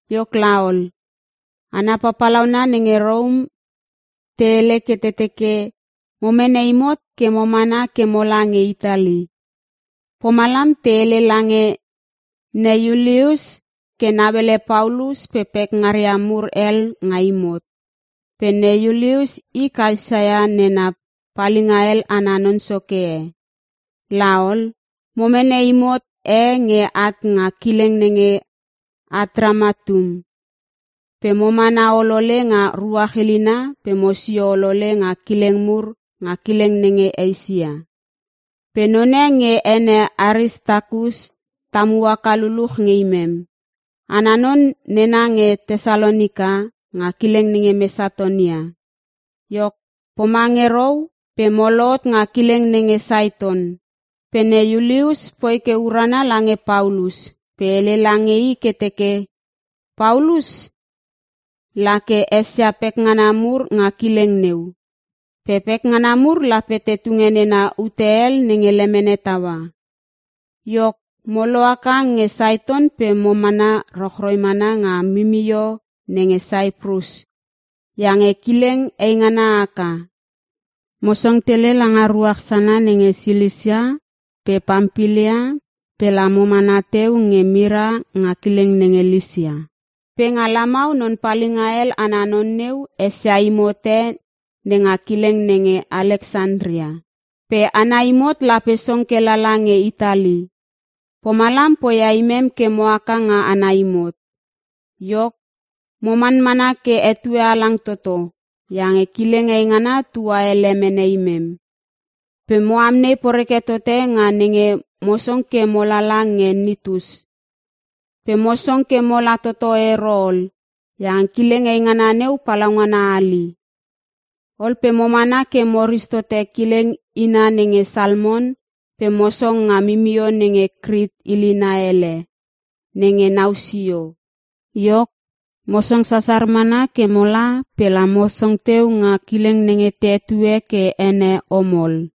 Iok laol, hana papalauna nenge Rom te hele ke te teke mo mene imot ke mo mana ke mola nge Itali. Pomalam te hele lange ne Iulius ke nauele Paulus pe pekngaria mur hel nga imot. Pe ne Iulius i Kaesa nena palinga hel ana non soke e. Laol, mo mene imot e nge at nga kileng nenge Atramitum pe mo mana olole nga ruach ilina pe mosio olole nga kileng mur nga kileng nenge Eisia. Pe none nge ene Aristakus tamu haka luluch nge imem. Ana non nena nge Tesalonika nga kileng nenge Mesatonia. Iok pomange rou pe mo lohot nga kileng nenge Saiton. Pe ne Iulius poi ke urana lange Paulus pe hele lange i ke teke Paulus la ke esia pekngana mur nga kileng neu. Pe pekngana mur lape te tunge nena ute hel nenge lemene taua. Iok mo lohaka nge Saiton pe mo mana rochroi mana nga mimio nenge Saiprus iange kileng eingana haka. Mo song tele langa ruach sana nenge Silisia pe Pampilia pe la mana teu nge Mira nga kileng nenge Lisia. Pe nga lamau non palinga hel ana non neu esia imot e nenga kileng nenge Aleksantria. Pe ana imot lape song ke lala nge Itali. Pomalam poia imem ke mo haka nga ana imot. Iok, mo manmana ke etue halang toto iange kileng eingana tua ele mene imem. Pe mo amnei poreke tote nga nenge mo song ke mo lala nge Nitus. Pe mo song ke mola toto ero ol iange kileng eingana neu palaungana hali. Ol pe mo mana ke mo ristote kileng ina nenge Salmon pe mo song nga mimio nenge Krit ilina hele nenge nau sio. Iok mo song sasar mana ke mola pe la mo song teu nga kileng nenge te hetue ke ene, Omol.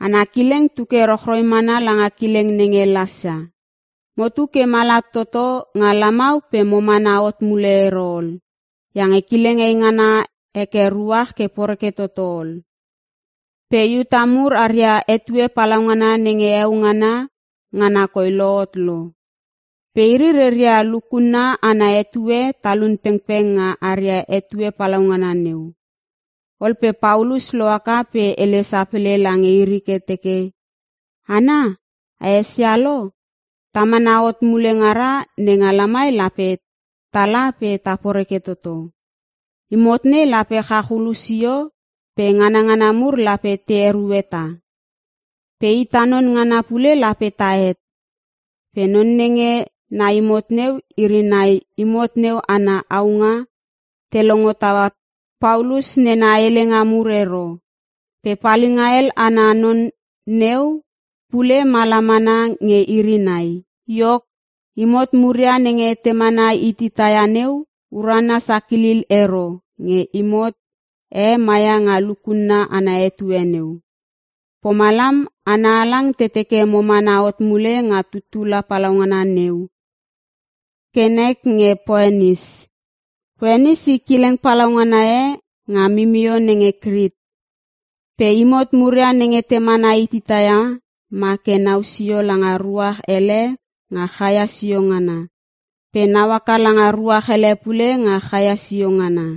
Ana kileng tu ke rochroi mana langa kilenge nenge Lasea. Motu ke mala toto nga lamau pe mo mana hot mule ero ol iange kileng eingana heke ruach ke poreke toto ol. Pe Iuta mur aria etue palaungana nenge heo ngana, ngana koi lohot lo. Pe iri reia lukunna ana etue talun pengpeng nga aria etue palaungana neu. Ol pe Paulus lohaka pe hele sapele lange iri ke teke, “Hana, a esia lo, ta mana hot mule ngara nenga lamai lape tala pe ta poreke toto. Imot nei lape chach hulu sio pe nganangana mur lape te erue tah. Pe ita non ngana pule lape tahet.” Pe non nenge na imot neu iri nai imot neu ana aunga, te longo taua Paulus nena helenga mur ero. Pe palinga hel ana non neu pule ma la mana nge iri nai. Iok, imot muria nenge te mana hitita ia neu, urana sakilil ero nge imot e maia nga lukunna ana etue neu. Pomalam hana halang te teke mo mana hot mule nga tuttula palaungana neu ke la moma ke nek nge Poenis. Poenis i kileng palaungana e nga mimio nenge Krit. Pe imot muria nenge te mana hitita ia ma ke nau sio langa ruach ele nga chaia sio ngana pe nau haka langa ruach ele pule nga chaia sio ngana.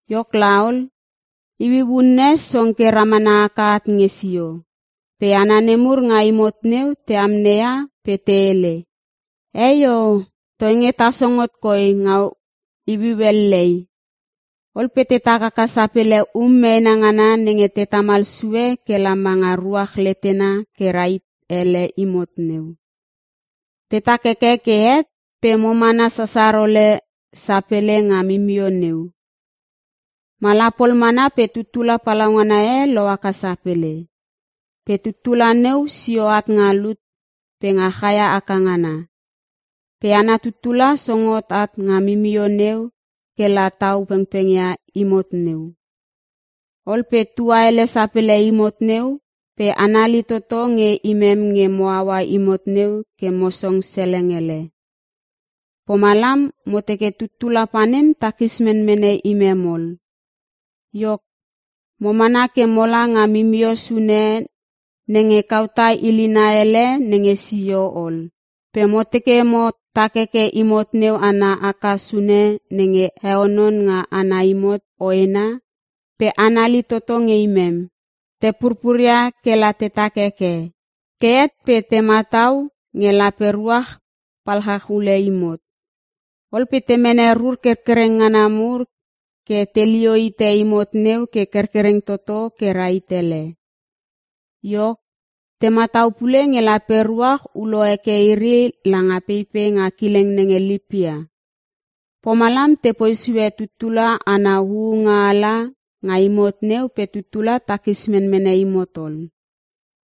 Iok laol, iuiu unne song ke ramana haka at nge sio. Pe hana nemur nga imot neu te amneia pe te hele, “Eio! Toinge ta song hot koi nga iuiu ellei.” Ol pe tetak haka sapele um meena ngana nenge te tamal sue ke la ma nga ruach letena ke rahit ele imot neu. Te tak heke ke het pe mo mana sasar ole sapele nga mimio neu. Mala pol mana pe tuttula palaungana e lohaka sapele. Pe tuttula neu sio at nga lut pe nga chaia aka ngana. Pe ana tuttula song hot at nga mimio neu ke la tau pengpeng ia imot neu. Ol pe tua ele sapele imot neu pe anali toto nge imem nge mo aua imot neu ke mo song seleng ele. Pomalam mo teke tuttula panem takis menmene imem ol. Iok, mo mana ke mola nga mimio sune nenge Kauta ilina ele nenge sio ol pe mo teke mo tak heke imot neu ana aka sune nenge heonon nga ana imot hoena pe anali toto nge imem. Te purpuria kela tetak heke. Ke het pe te matau nge lape ruach palchach ule imot. Ol pe te mene rur kerkereng ngana mur ke telio hite imot neu ke kerkereng toto ke rahit ele. Iok, te matau pule nge lape ruach ulo heke iri langa peipei nga kileng nenge Lipia. Pomalam tepoi sue tutula ana huunga ala nga imot neu pe tuttula takis menmene imot ol.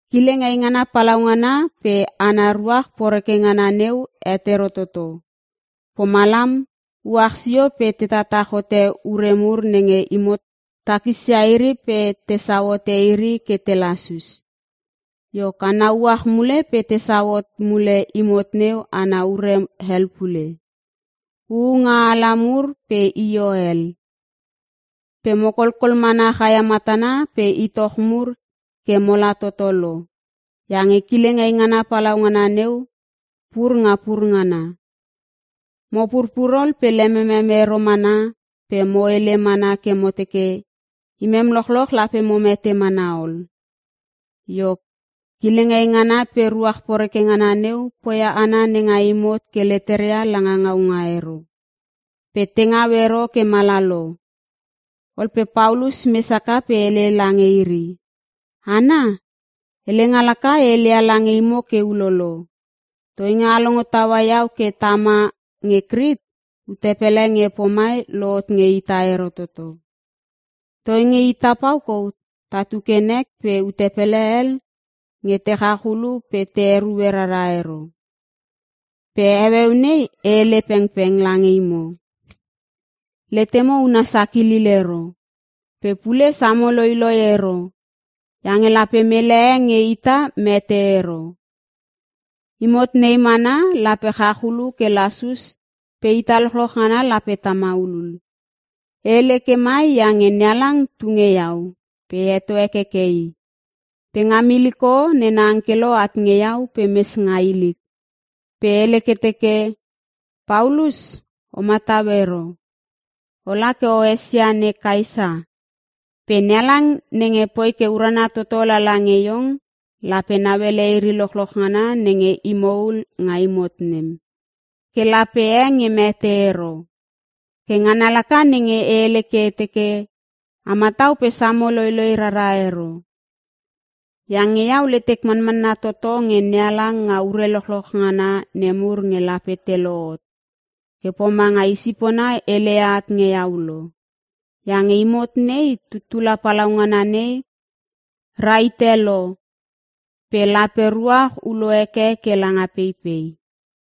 Kileng eingana palaungana pe ana ruach poreke ngana neu het ero toto. Pomalam uach sio pe te tatach hote ure mur nenge imot takisia iri pe tesau hote iri ke te lasus. Iok ana uach mule pe tesau hot mule imot neu ana ure hel pule. (Huunga ala mur pe io hel) Pe mo kolkol mana chaia matana pe itoch mur ke mala toto lo iange kileng eingana palaungana neu pur nga pur ngana. Mo purpur ol pe lememem ero mana pe mo hele mana ke mo teke imem lochloch lape mo mete mana ol. Iok, kileng eingana pe ruach poreke ngana neu poia hana nenga imot ke leteria langa ngaunga ero, pe te ngau ero ke mala lo. Ol pe Paulus mes haka pe hele lange iri, “Hana! Helenga laka e heleia lange imo ke ulolo. Toinge a longo taua iau ke tama nge Krit, ute pele nge pomai lohot nge ita ero toto. Toinge ita pau kou tatu ke nek pe ute pele hel nge te chach ulu pe te erue rara ero. Pe heueu nei e hele pengpeng lange imo, letemo una sakilil ero. Pe pule samo loiloi ero iange lape mele e nge ita mete ero. Imot nei mana lape chach ulu ke lasus pe ita lochloch ngana lape ta maulul. E hele ke mai iange NeHalang tu nge iau pe e heto hekeke i. Pe nga miliko, nena angkelo at nge iau pe mes nga ilik, pe hele ke teke, ‘Paulus, o matau ero. Ola ke o esia ne Kaesa. Pe NeHalang nenge poi ke urana toto lala nge iong, lape nauele iri lochoch ngana nenge imo ul nga imot nem, ke lape e nge mete ero.’ Ke ngana laka nenge e hele ke e teke, a matau pe samo loiloi rara ero. Iange iau letek manmanna toto nge NeHalang nga ure lochoch ngana nemur nge lape te lohot, ke pomanga i sipona heleia at nge iau lo. Iange imot nei, tuttula palaungana nei rahite lo pe lape ruach ulo heke ke langa peipei.”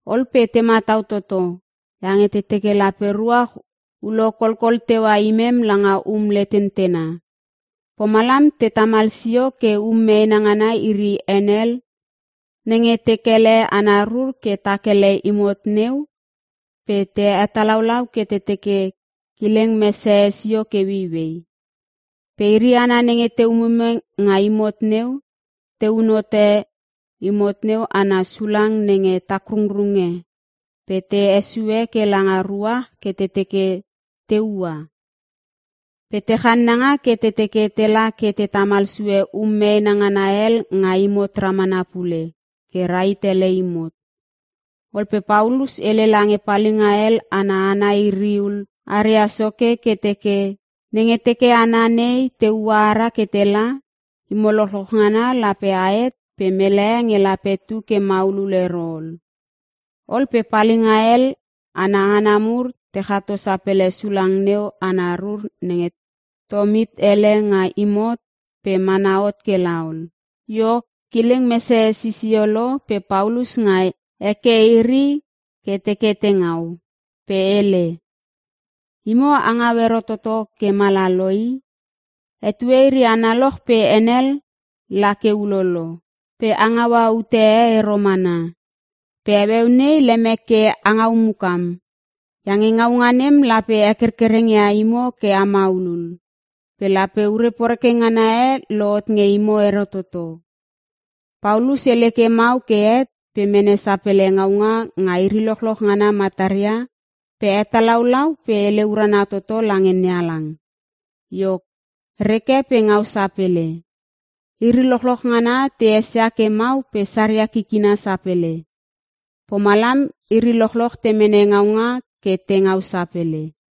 Ol pe te matau toto iange te teke lape ruach ulo kolkol teua imem langa um letentena. Pomalam te tamal sio ke um meena ngana iri henel nenge te kele ana rur ke tak ele imot neu pe te hetalaulau ke te teke kileng mesehe sio ke ueiuei. Pe iri hana nenge te umume nga imot neu, te un hote imot neu ana sulang nenge takrungrunge pe te hesue ke langa ruach ke te teke te ua. Pe te channanga ke te teke tela ke te tamal sue um meena ngana hel nga imot ramana pule ke rahit ele imot. Ol pe Paulus hele lange palinga hel ana hana iri ul aria soke ke teke, “Nenge teke hana nei teua ara ke tela, imo lochloch ngana lape ahet pe mele e nge lape tu ke maulul ero ol.” Ol pe palinga hel ana hana mur te chato sapele sulang neu ana rur nenge te tom hit ele nga imot pe mana hot ke la ol. Iok, kileng mesehe sisio lo pe Paulus ngai heke iri ke teke te ngau. Pe hele, “Imo a ngau ero toto ke mala lo i. Etue iri analoch pe henel la ke ulolo, pe a ngaua ute e ero mana. Pe heueu nei, lemek ke a ngau mukam. Iange ngaunga nem lape hekerkereng ia imo ke a maulul. Pe lape ure poreke ngana e lohot nge imo ero toto.” Paulus hele ke mau ke het pe mene sapele ngaunga nga iri lochloch ngana mataria pe hetalaulau pe hele urana toto lange NeHalang. Iok, reke pe ngau sapele. Iri lochloch ngana te esia ke mau pe saria kikina sapele. Pomalam iri lochloch te mene ngaunga ke te ngau sapele.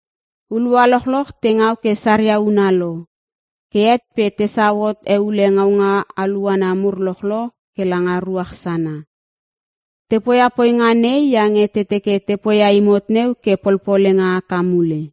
Hulua lochloch te ngau ke saria una lo, ke het pe tesau hot eule ngaunga aluana mur lochloch ke langa ruach sana. Te poia poinga nei iange te teke te poia imot neu ke polpolenga haka mule.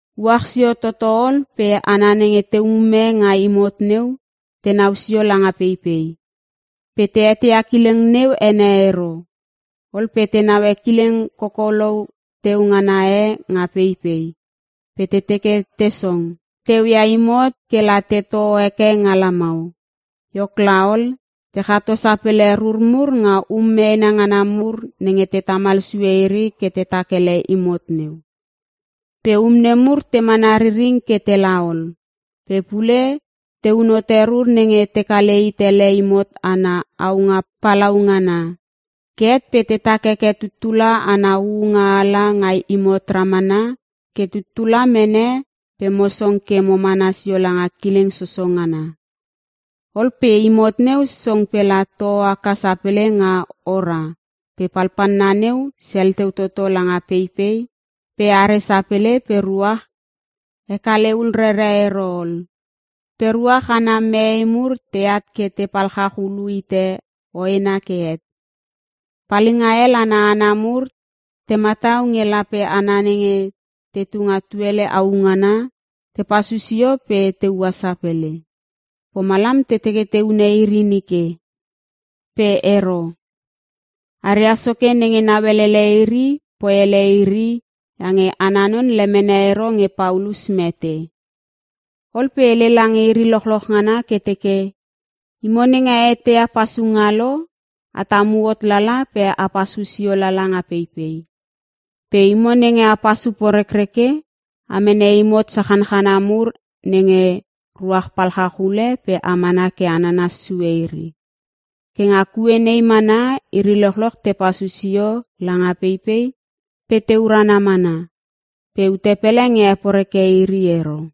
Uach sio toto ol pe hana nenge te umume nga imot neu tenau sio langa peipei, pe te eteia kileng neu ene ero. Ol pe te naue kileng kokolou teu ngana e nga peipei pe te teke te song teu ia imot ke la tetoh heke nga lamau. Iok laol, te chato sapele rur mur nga um meena ngana mur nenge te tamal sue iri ke tetak ele imot neu. Pe um nemur te mana riring ke tela ol. Pe pule teun hote rur nenge te kale hit ele imot ana aunga palaungana. Ke het pe tetak heke tuttula ana huunga ala nga imot ramana ke tuttula mene pe mo song ke mo mana sio langa kileng soso ngana. Ol pe imot neu song pela toh haka sapele nga ora pe palpalna neu sel teu toto langa peipei pe are sapele pe ruach hekale hul rere ero ol. Pe ruach ana mee mur teat ke te palchach ulu hite hoena ke het. Palinga hel ana hana mur te matau nge lape hana nenge tetu nga tuele au ngana, te pasu sio pe te ua sapele. Pomalam te teke te hune iri nike. Pe ero. Aria soke nenge nauelele iri poi ele iri iange ana non lemene ero nge Paulus mete. Ol pe hele lange iri lochloch ngana ke teke, “Imo nenge a eteia pasunga lo, a tamu hot tala pe a pasu sio lala nga peipei. Pe imo nenge a pasu porekreke, a mene imot sachanchana mur nenge ruach palchach ule pe a mana ke a nanas sue iri.” Ke nga kue nei mana iri lochloch te pasu sio langa peipei pe te urana mana. Pe ute pele nge heporeke iri ero.